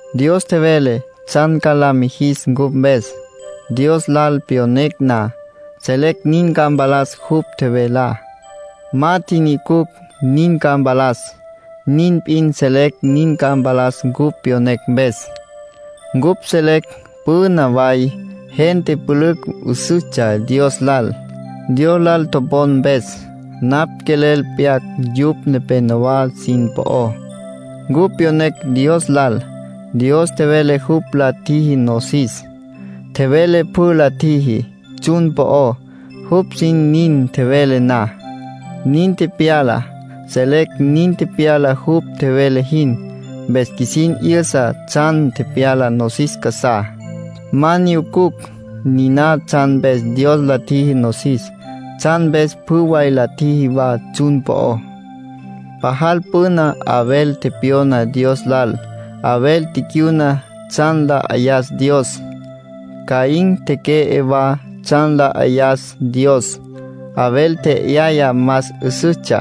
Dios tjevele tsjan ca la mijis cupj mpes. Dios lal pyonecj na, selecj nin ca mpalas jupj tjevelá. Ma tjinyucucj nin ca mpalas; nin p'in selecj nin ca mpalas cupj pyonecj mpes. Cupj selecj püna way gente pülücj 'üsüstsja Dios lal, Dios lal topon mpes. Napj quelel pyac yupj nepénowa sin po'ó. Cupj pyonecj Dios lal. Dios tjevele jupj la tjiji nosis. Tjevele pjü la tjiji tsjun po'ó. Jupj sin nin tjevele na, nin tepyala. Selecj nin tepyala jupj tjevele jin, mpes qjuisin 'yüsa tsjan tepyala nosis casá. Ma nyucucj niná tsjan mpes Dios la tjiji nosis, tsjan mpes pjü way la tjiji wa tsjun po'ó. Pajal püna Abel tepyona Dios lal. Abel ticyuna tsjan la 'ayas Dios. Caín teque'e wa tsjan la 'ayas Dios. Abel tje'yaya más 'üsüstsja;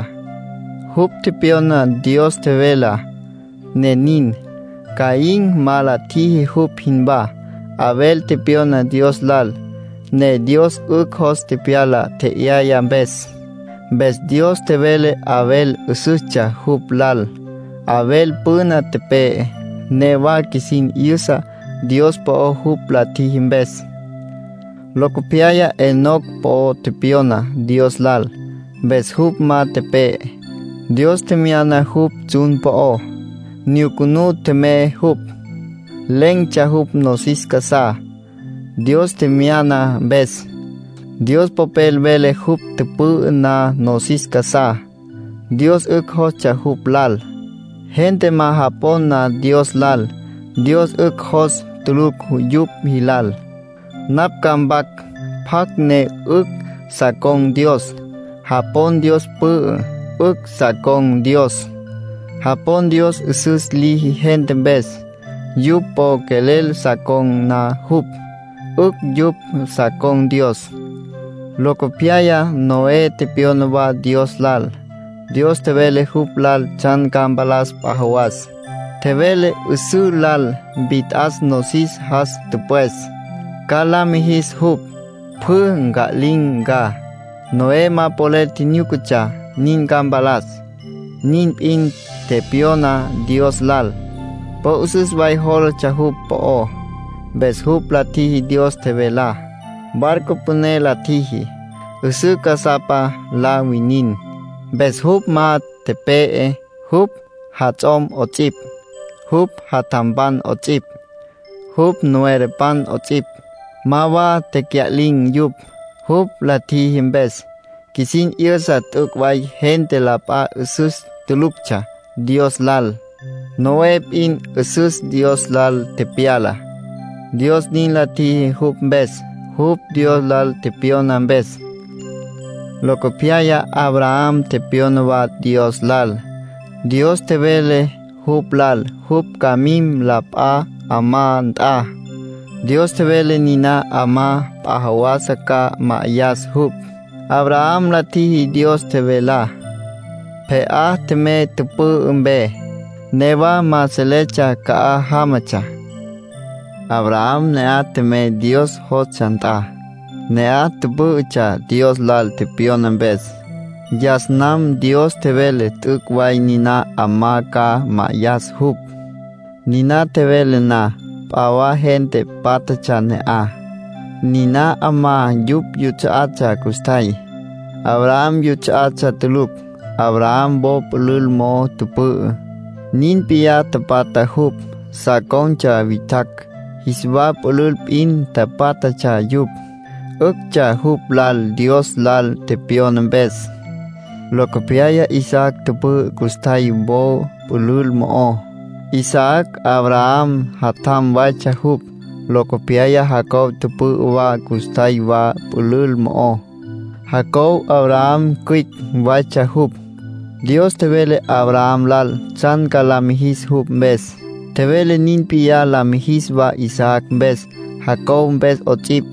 jupj tepyona Dios tjevelá, ne nin. Caín ma la tjiji jupj jinwá. Abel tepyona Dios lal, ne Dios 'ücj jos tepyala tje'yaya mpes. Mpes Dios tjevele Abel 'üsüstsja jupj lal. Abel püna tepe'e; newa qjuisin 'yüsa Dios po'ó jupj la tjiji mpes. Locopyaya Enoc po tepyona Dios lal, mpes jupj ma tepe'e. Dios tjemyana jupj tsjun po'ó, nyucunú tjemey jupj. Len̈tsja jupj nosis casá Dios tjemyana mpes. Dios Popel vele jupj tüpü'ü na nosis casá, Dios 'ücj jostsja jupj lal. Gente ma japon na Dios lal, Dios 'ücj jos tulucj yupj jilal. Napj ca mpac pjacj ne 'ücj sa con̈ Dios. Japon Dios pü'ü, 'ücj sa con̈ Dios. Japon Dios 'üsüs liji gente mpes, yupj po quelel sa con̈ na jupj, 'ücj yupj sa con̈ Dios. Locopyaya Noé tepyona wa Dios lal. Dios tjevele jupj lal tsjan ca mpalas p'a jawas. (Tjevele 'üsǘ lal mpit'as nosis jas tüpwes, ca la mijis jupj, pjü nca'lin̈ ca.) Noé ma polel tjinyúcatsja nin ca mpalas. Nin p'in tepyona Dios lal, po 'üsüs way jólatsja jupj po'ó. Mpes jupj la tjiji Dios tjevelá. Barco püné la tjiji, 'üsǘ casapa la winin. Mpes jupj ma tepe'e; jupj jats'om 'ots'ipj, jupj jatjampan 'ots'ipj, jupj nuerapan 'ots'ipj, ma wa tecya'lin̈ yupj. Jupj la tjiji mpes, qjuisin 'yüsa t'üc' way gente la p'a 'üsüs tuluctsja Dios lal. Noé p'in 'üsüs Dios lal tepyala; Dios nin la tjiji jupj mpes, jupj Dios lal tepyona mpes. Locopyaya Abraham tepyona wa Dios lal. Dios tjevele jupj lal jupj ca mim la p'a 'amá nt'a. Dios tjevele niná 'amá p'a jawas ca ma'ayas jupj. Abraham la tjiji Dios tjevelá. Pje'á tjemey tüpü'ü mpe; newa ma seletsja ca'aj jámatsja. Abraham ne'aj tjemey Dios jostsja nt'a. Ne'aj tüpǘ'ütsja Dios lal tepyona mpes. Yas nam Dios tjevele t'üc' way niná 'amá ca ma'ayas jupj. Niná tjevele na, p'a wa gente pátjatsja ne'aj. Niná 'amá yupj yuts'a'atsja custjay, Abraham juts'a'atsja tulucj. Abraham wo pülül mo'o tüpü'ü, nin p'iyá tapatja jupj sa con̈tsja witjacj, jis wa pülül p'in tapátjatsja yupj. 'Üctsja jupj lal Dios lal tepyona mpes. Locopyaya Isaac tüpü'ü custjay wo pülül mo'ó. Isaac Abraham jatjam waytsja jupj. Locopyaya Jacob tüpü'ü wa custjay wa pülül mo'ó. Jacob Abraham cüicj waytsja jupj. Dios tjevele Abraham lal tsjan ca la mijis jupj mpes. Tjevele nin p'iyá la mijis wa Isaac mpes, Jacob mpes 'ots'ipj.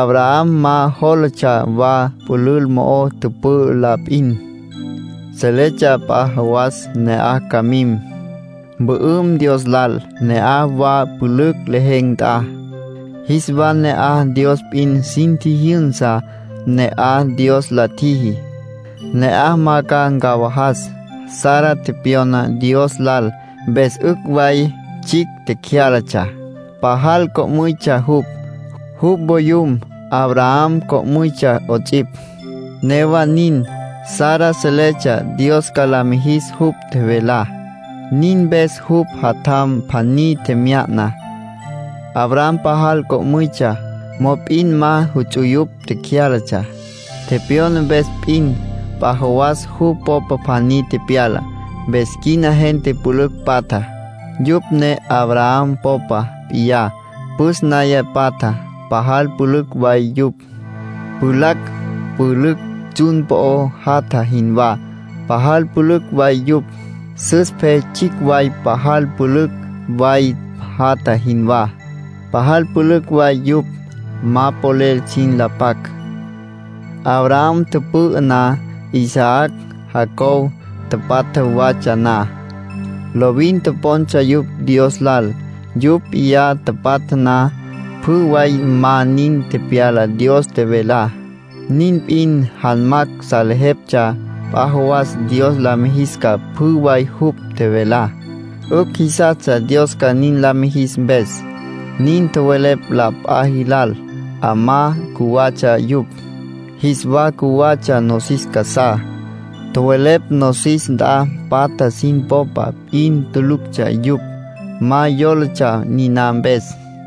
Abraham ma jólatsja wa pülül mo'o tüpü'ü la p'in; seletsja p'a jawas ne'aj ca mim, mpü'üm Dios lal, ne'aj wa pülücj lejen̈ nt'a. Jis wa ne'aj Dios p'in sin tjijyünsa. Ne'aj Dios la tjiji. Ne'aj ma ca ncawajas. Sara tepyona Dios lal, mpes 'ücj way tsjicj tecyálatsja. Pajal co'müytsja jupj. Jupj voyum, Abraham, co'müytsja 'ots'ipj. Newa nin, Sara seletsja Dios ca la mijis jupj tjevelá. Nin mpes jupj jatjam pjaní tjemya'na. Abraham pajal co'müytsja, mop'in ma juts'uyupj cyálatsja. Tepyona mpes p'in, p'a jawas jupj popa pjaní tepyala. Mpes quina gente pülücj patja, yupj ne Abraham popa p'iyá, püs naya patja. Pajal pülücj way yupj, pjulacj pülücj tsjun po'o jatja jinwá. Pajal pülücj way yupj, sus pe tsjicj way pajal pülücj way jatja jinwá. Pajal pülücj way yupj, ma polel sin la pac. Abraham tüpü'ü na, Isaac, Jacob, tapatja watsja na, lovin topontsja yupj Dios lal. Yupj p'iyá tapatja na, pjü way ma nin tepyala Dios tjevelá. Nin p'in, janmacj salejeptsja p'a jawas Dios la mijis ca pjü way jupj tjevelá; 'ücj jisastsja Dios ca nin la mijis mpes. Nin tjowelepj la p'a jilal 'amá cjuwatsja yupj, jis wa cjuwatsja nosis casá. Tjowelepj nosis nt'a patja sin popa p'in tuluctsja yupj. Ma yólatsja niná mpes.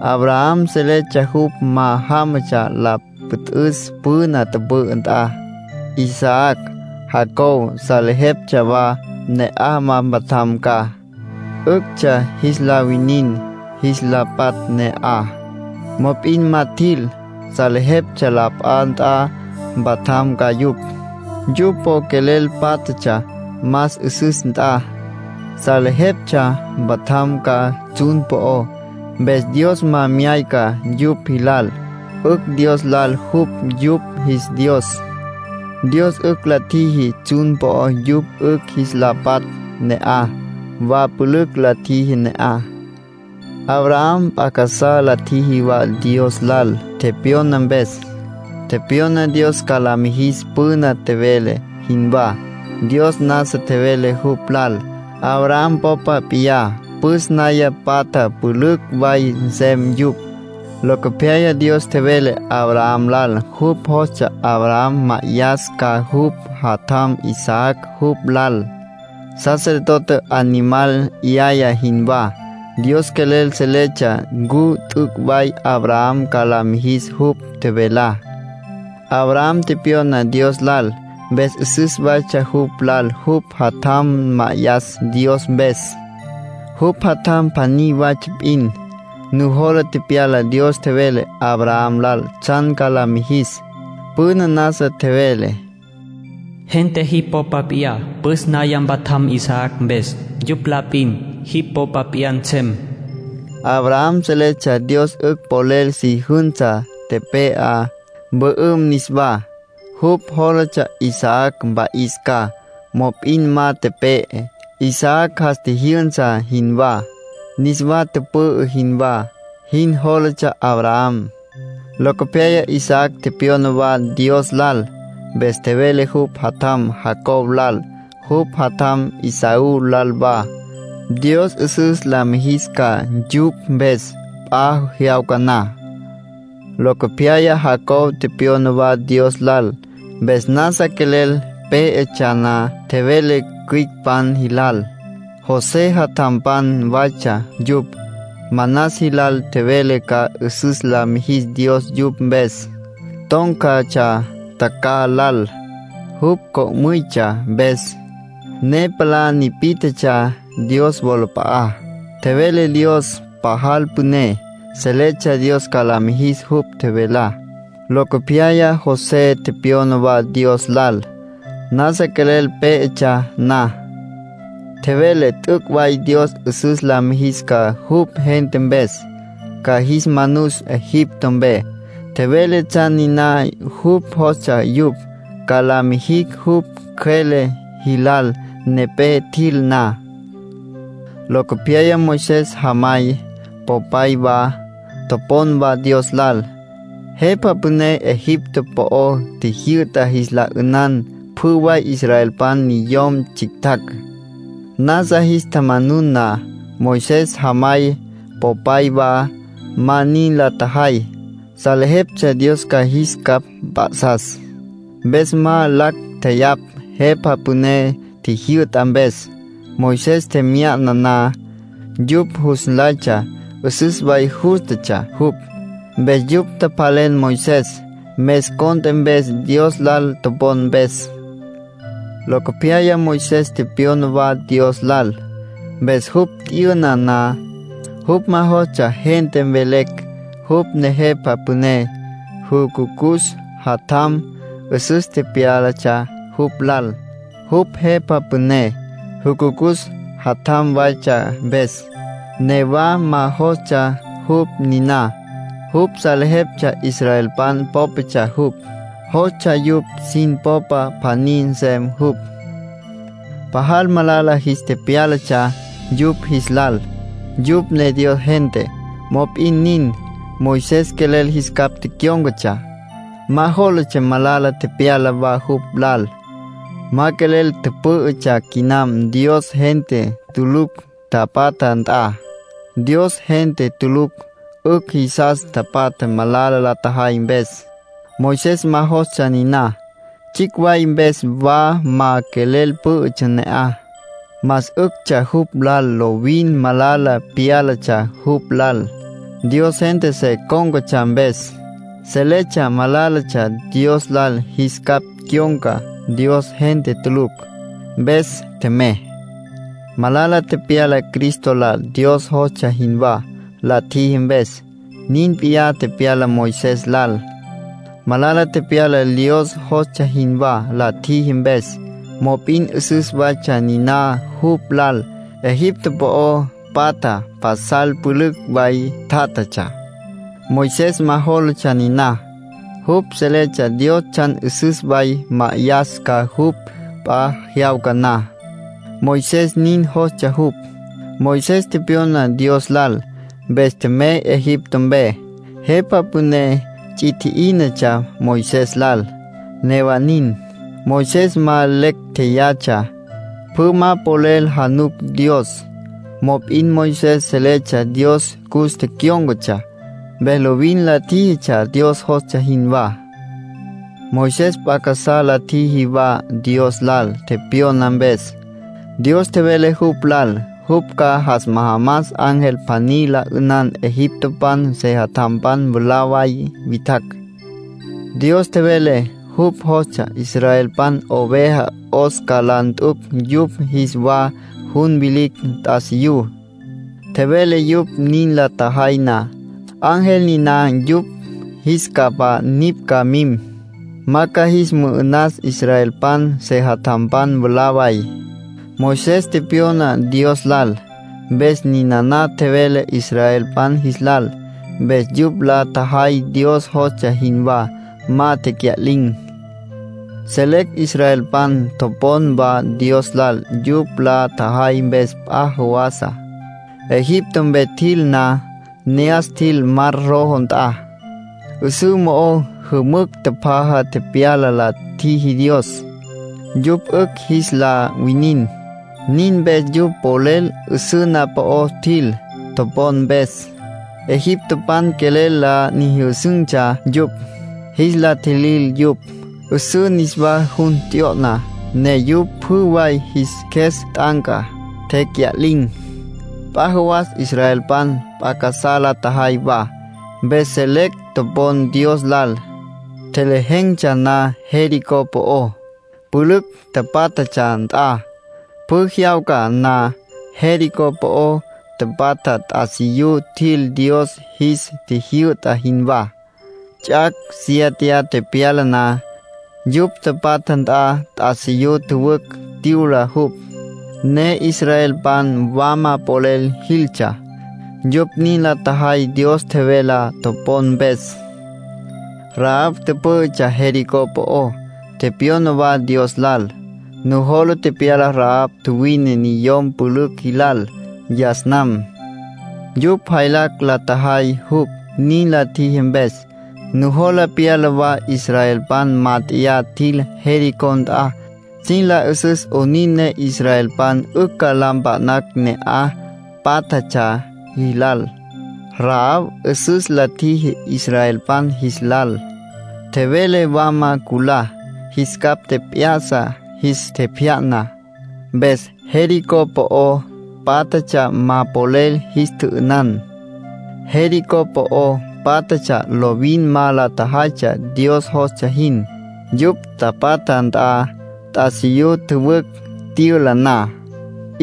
Abraham seletsja jupj ma jámatsja la püt'üs püna tüpü'ü nt'a. Isaac, Jacob, salejeptsja wa, ne'aj ma mpatjam ca. 'Üctsja jis la winin jis la patj ne'aj, mop'in ma tjil. Salejeptsja la p'a nt'a mpatjam ca yupj. Yupj po quelel pátjatsja más 'üsüs nt'a. Salejeptsja mpatjam ca tsjun po'ó. Mpes Dios ma myayca yupj jilal. 'Ücj Dios lal jupj yupj jis Dios. Dios 'ücj la tjiji tsjun po'ó yupj 'ücj jis la patj ne'aj. Wa pülücj la tjiji ne'aj. Abraham p'a casá la tjiji wa Dios lal tepyona mpes. Tepyona Dios ca la mijis püna tjevele jinwá. Dios nasa tjevele jupj lal Abraham popa p'iyá püs naya patja pülücj way nsem yupj. Locopyaya Dios tjevele Abraham lal jupj jostsja Abraham ma'ayas ca jupj jatjam Isaac jupj lal, sacerdote animal 'yaya jinwá. Dios quelel seletsja ncu t'üc' way Abraham ca la mijis jupj tjevelá. Abraham tepyona Dios lal, mpes 'üsüs waytsja jupj lal jupj jatjam ma'ayas Dios mpes, jupj jatjam pjaní waytsja p'in. Nujola pyala Dios tjevele Abraham lal tsjan ca la mijis. Püna nasa tjevele: “Gente jipj popa p'iyá püs naya mpatjam Isaac mpes. Yupj la p'in jipj popa p'iyá nsem.” Abraham seletsja Dios 'ücj polel si jünsa tepe'á, mpü'üm niswá. Jupj jólatsja Isaac mpa'is ca. Mop'in ma tepe'e. Isaac jas tjijyünsa jinwá, niswa tüpü'ü jinwá jin jólatsja Abraham. Locopyaya Isaac tepyona wa Dios lal. Mpes tjevele jupj jatjam Jacob lal, jupj jatjam Esaú lal wa, Dios 'üsüs la mijis ca yupj mpes p'a jyawca na. Locopyaya Jacob tepyona wa Dios lal. Mpes nasa quelel pé'etsja na, tjevele cüicpan jilal; José jatjampan waytsja yupj. Manas jilal tjevele ca 'üsüs la mijis Dios yupj mpes. Tón̈catsja tjacjaj lal, jupj co'müytsja mpes, ne palá nipí'tjetsja Dios wolap'a'á, tjevele Dios pajal püné. Seletsja Dios ca la mijis jupj tjevelá. Locopyaya José tepyona wa Dios lal. Nasa quelel pé'etsja na, tjevele t'üc' way Dios 'üsüs la mijis ca jupj gente mpes, ca jis manus Egipto mpe. Tjevele tsjan niná jupj jostsja yupj ca la mijicj jupj cjüele jilal nepé tjil na. Locopyaya Moisés jamay, popay wa, topon wa Dios lal. Jepa püné Egipto po'ó tjijyü'ta jis la 'ünan pjü way israelpan niyom tsjictjacj, nasa jis tjamanun na. Moisés jamay, popay wa, ma nin la tjajay. Salejeptsja Dios ca jis capj mp'a'sas. Mpes ma lacj tjeyapj jepa püné tjijyü'ta mpes. Moisés tjemya'na na, yupj jus nlaytsja 'üsüs way jústatsja jupj. Mpes yupj tjapjalen Moisés mes cont'e mpes Dios lal topon mpes. Locopyaya Moisés tepyona wa Dios lal. Mpes jupj t'yüna na, jupj ma jostsja gente mvelecj jupj ne jepa püné jucucus jatjam. 'Üsüs tepyálatsja jupj lal, jupj jepa püné jucucus jatjam waytsja mpes. Newa ma jostsja jupj niná. Jupj seletsja israelpan pópatsja jupj, jostsja yupj sin popa pjaní nsem jupj. Pajal malala jis tepyálatsja yupj jis lal, yupj ne Dios gente. Mop'in nin, Moisés quelel jis capj tecyón̈catsja. Ma jólatsja malala tepyala wa jupj lal. Ma quelel tüpǘ'ütsja quinam Dios gente tulucj tapatja nt'a. Dios gente tulucj 'ücj jisas tapatja malala la tjajay mpes. Moisés ma jostsja niná. Tsjicj way mpes wa ma quelel pǘ'ütsja ne'aj. Más 'üctsja jupj lal lovin malala pyálatsja jupj lal, Dios gente se cón̈catsja mpes. Seletsja malálatsja Dios lal jis capj cyon̈ca Dios gente tulucj, mpes tjemey. Malala tepyala Cristo lal Dios jostsja jinwá la tjiji mpes. Nin p'iyá tepyala Moisés lal. Malala tepyala Dios jostsja jinwá la tjiji mpes, mop'in 'üsüs waytsja niná jupj lal. Egipto po'o patja pasal pülücj way tatsja; Moisés ma jólatsja niná. Jupj seletsja Dios tsjan 'üsüs way ma'ayas ca jupj p'a jyawca na. Moisés nin jostsja jupj. Moisés tepyona Dios lal. Mpes tjemey Egipto mpe. Jepa püné ts'i tji'ínatsja Moisés lal; newa nin, Moisés ma lecj tjeyatsja. Pjü ma polel januc Dios, mop'in Moisés seletsja Dios cus tecyón̈catsja. Mpes lovin la tjíjitsja Dios jostsja jinwá. Moisés p'a casá la tjiji wa Dios lal tepyona mpes. Dios tjevele jupj lal jupj ca jas majamas ángel pjaní la 'ünan egiptopan sejatjampan mwalá way witjacj. Dios tjevele jupj jostsja israelpan oveja 'os ca la nt'ucj yupj jis wa jun vilicj t'asiyú. Tjevele yupj nin la tjajay na, ángel niná yupj jis capa nipj ca mim, ma ca jis mü'ü'nas israelpan sejatjampan mwalá way. Moisés tepyona Dios lal, mpes ninana tjevele israelpan jis lal. Mpes yupj la tjajay Dios jostsja jinwá. Ma tecya'lin̈. Selecj israelpan topon wa Dios lal yupj la tjajay mpes p'a jawasa. Egipto mpe tjil na, ne'as tjil Mar Rojo nt'a. 'Üsǘ mo'ó jümücj tjapjaja tepyala la tjiji Dios, yupj 'ücj jis la winin. Nin mpes yupj polel 'üsǘ na'aj po'ó tjil topon mpes. Egiptopan quelel la nyüjüsün̈tsja yupj, jis la tjilil yupj. 'Üsǘ niswa jun t'yo'na, ne yupj pjü way jis qjues t'anca, tecya'lin̈. P'a jawas israelpan p'a casá la tjajay wa, mpes selecj topon Dios lal, tjelejen̈tsja na Jericó po'ó, pülücj pátjatsja nt'a. Pjü jyawca na Jericó po'o tapatja t'asiyú tjil Dios jis tjijyü'ta jinwá. Ts'ac' siéteya tepyala na, yupj tapatja nt'a t'asiyú tjüwücj tyüla jupj, ne israelpan wama polel jiltsja. Yupj nin la tjajay Dios tjevelá topon mpes. Rahab tüpǘ'ütsja Jericó po'ó, tepyona wa Dios lal. Nujola pyala Rahab tjuwine niyom pülücj jilal yas nam, yupj jaylacj la tjajay jupj nin la tjiji mpes. Nujola pyala wa israelpan mát'eya tjil Jericó nt'a sin la 'üsüs 'onin ne israelpan 'ücj ca la mpa'nacj ne'aj pátjatsja jilal. Rahab 'üsüs la tjiji israelpan jis lal, tjevele wama culá. Jis capj tjep'ya'sa, jis tjepjya'na, mpes Jericó po'o pátjatsja ma polel jis tjü'ünan. Jericó po'o pátjatsja lovin ma la tjajaytsja Dios jostsja jin. Yupj tapatja nt'a t'asiyú tjüwücj tyüla na,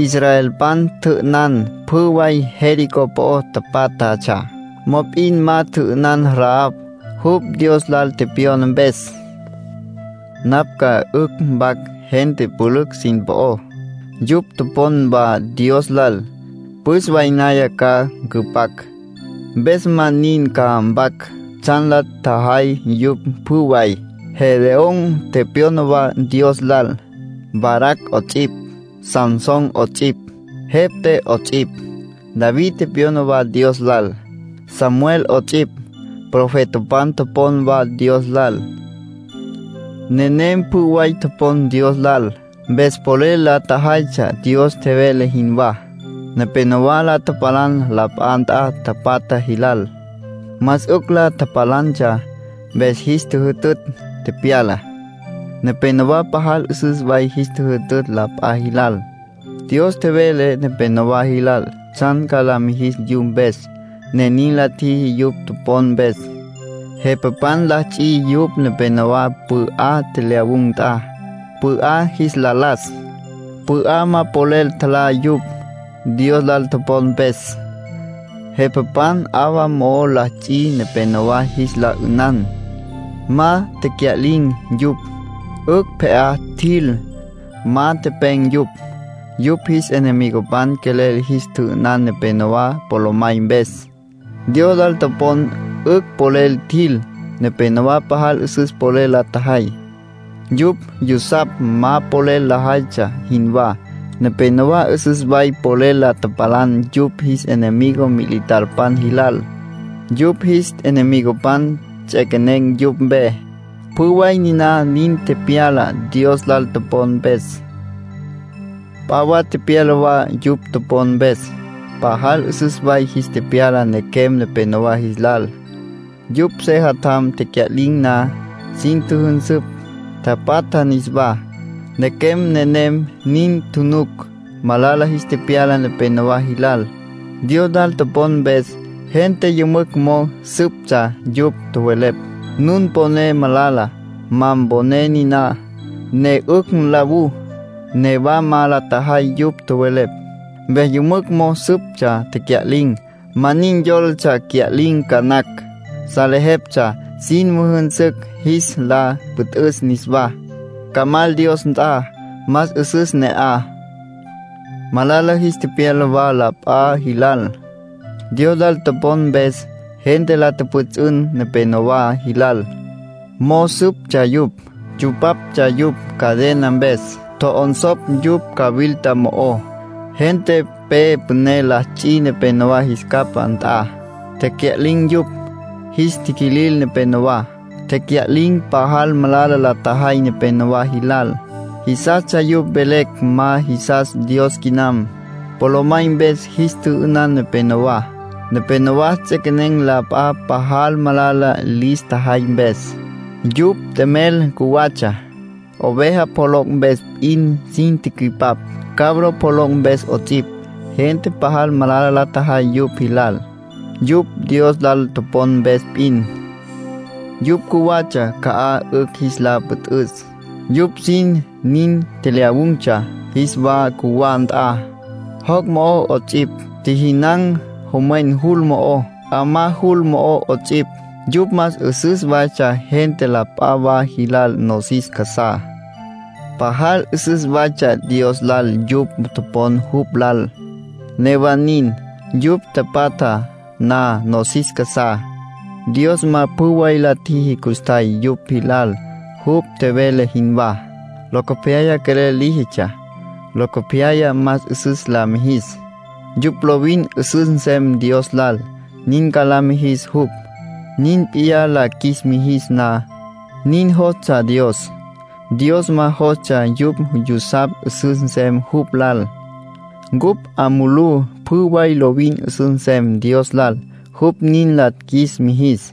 israelpan tjü'ünan pjü way Jericó po'o pátjatsja. Mop'in ma tjü'ünan Rahab, jupj Dios lal tepyona mpes. Napj ca 'ücj mpac gente pülücj sin po'ó, yupj topon wa Dios lal. Nin la cüjay, püs way naya ca cüpac. Mpes ma nin ca mpac tsjan la tjajay yupj pjü way. Gedeón tepyona wa Dios lal, Barac 'ots'ipj, Sansón 'ots'ipj, Jefté 'ots'ipj. David tepyona wa Dios lal, Samuel 'ots'ipj. Profetapan topon wa Dios lal. Nenem pjü way topon Dios lal, mpes polel la tjajaytsja Dios tjevele jinwá. Nepénowa la tapalan la p'a nt'a tapatja jilal. Más 'ücj la tapalantsja, mpes jis tjüjütütj tepyala. Nepénowa pajal 'üsüs way jis tjüjütütj la p'a jilal. Dios tjevele nepénowa jilal tsjan ca la mijis yupj mpes, ne nin la tjiji yupj topon mpes. Jepapan la ts'i yupj nepenowá león tjelyawun̈ nt'a, león jis la las. León ma polel tjalá yupj, Dios lal topon mpes. Jepapan 'awa mo'o la ts'i nepenowá jis la 'ünan. Ma tecya'lin̈ yupj; 'ücj pje'á tjil, ma tepen̈ yupj. Yupj jis enemigopan quelel jis tjü'ünan nepenowá polomay mpes. Dios lal topon 'ücj polel tjil. Nepénowa pajal 'üsüs polel la tjajay, yupj yusapj ma polel lajaytsja jinwá. Nepénowa 'üsüs way polel la tapalan yupj jis enemigo militarpan jilal. Yupj jis enemigopan ts'equenen̈ yupj mpe. Pjü way niná nin tepyala Dios lal topon mpes. P'a wa tepyala wa yupj topon mpes. Pajal 'üsüs way jis tepyala nequem nepenowá jis lal. Yupj sejatjam tecya'lin̈ na, sin tjüjünsüpj, tapatja niswá; nequem nenem nin tjunuc. Malala jis tepyala nepenowá jilal, Dios lal topon mpes. Gente yümücj mo'o süptsja yupj. Tjowelepj: “Nun poné malala. Ma mponé niná, ne 'ücj nlawú.” Newa ma la tjajay yupj tjowelepj. Mpes yümücj mo'o süptsja, tecya'lin̈. Ma nin yólatsja cya'lin̈ ca nacj; salejeptsja sin müjünsücj jis la püt'üs niswá, ca mal Dios nt'a. Más 'üsüs ne'aj. Malala jis tepyala wa la p'a jilal, Dios lal topon mpes. Gente la tjüpjüts'ün nepenowá jilal, mo'o süptsja yupj. Tsupaptsja yupj cadena mpes, tjo'onsopj yupj cawilta mo'ó. Gente pe püné la ts'i nepenowá jis capá nt'a, tecya'lin̈ yupj. Jis tiquilil nepenowá, tecya'lin̈. Pajal malala la tjajay nepénowa jilal, jisastsja yupj mvelecj ma jisas Dios quinam. Polomay mpes jis tjü'ünan nepenowá. Nepénowa ts'equenen̈ la p'a pajal malala lis tjajay mpes. Yupj t'emel cjuwatsja. Oveja pjoloc' mpes p'in sin tücüipap, cabro pjoloc' mpes 'ots'ipj. Gente pajal malala la tjajay yupj jilal, yupj Dios lal topon mpes p'in. Yupj cjuwatsja ca'aj 'ücj jis la püt'üs. Yupj sin nin tjelyawun̈tsja jis wa cjuwá nt'a, joc' mo'ó 'ots'ipj. Tjijinan̈ jomwen jul mo'ó, 'amá jul mo'ó 'ots'ipj. Yupj más 'üsüs waytsja gente la p'a wa jilal nosis casá. Pajal 'üsüs waytsja Dios lal yupj topon jupj lal. Newa nin, yupj tapatja na nosis casá, Dios ma pjü way la tjiji custjay yupj jilal, jupj tjevele jinwá. Locopyaya quelel líjitsja, locopyaya más 'üsüs la mijis. Yupj lovin 'üsüs nsem Dios lal, nin ca la mijis jupj, nin p'iyá la qjuis mijis na. Nin jostsja Dios. Dios ma jostsja yupj yusapj 'üsüs nsem jupj lal. Cupj 'a mulú pjü way lovin 'üsüs nsem Dios lal, jupj nin la qjuis mijis.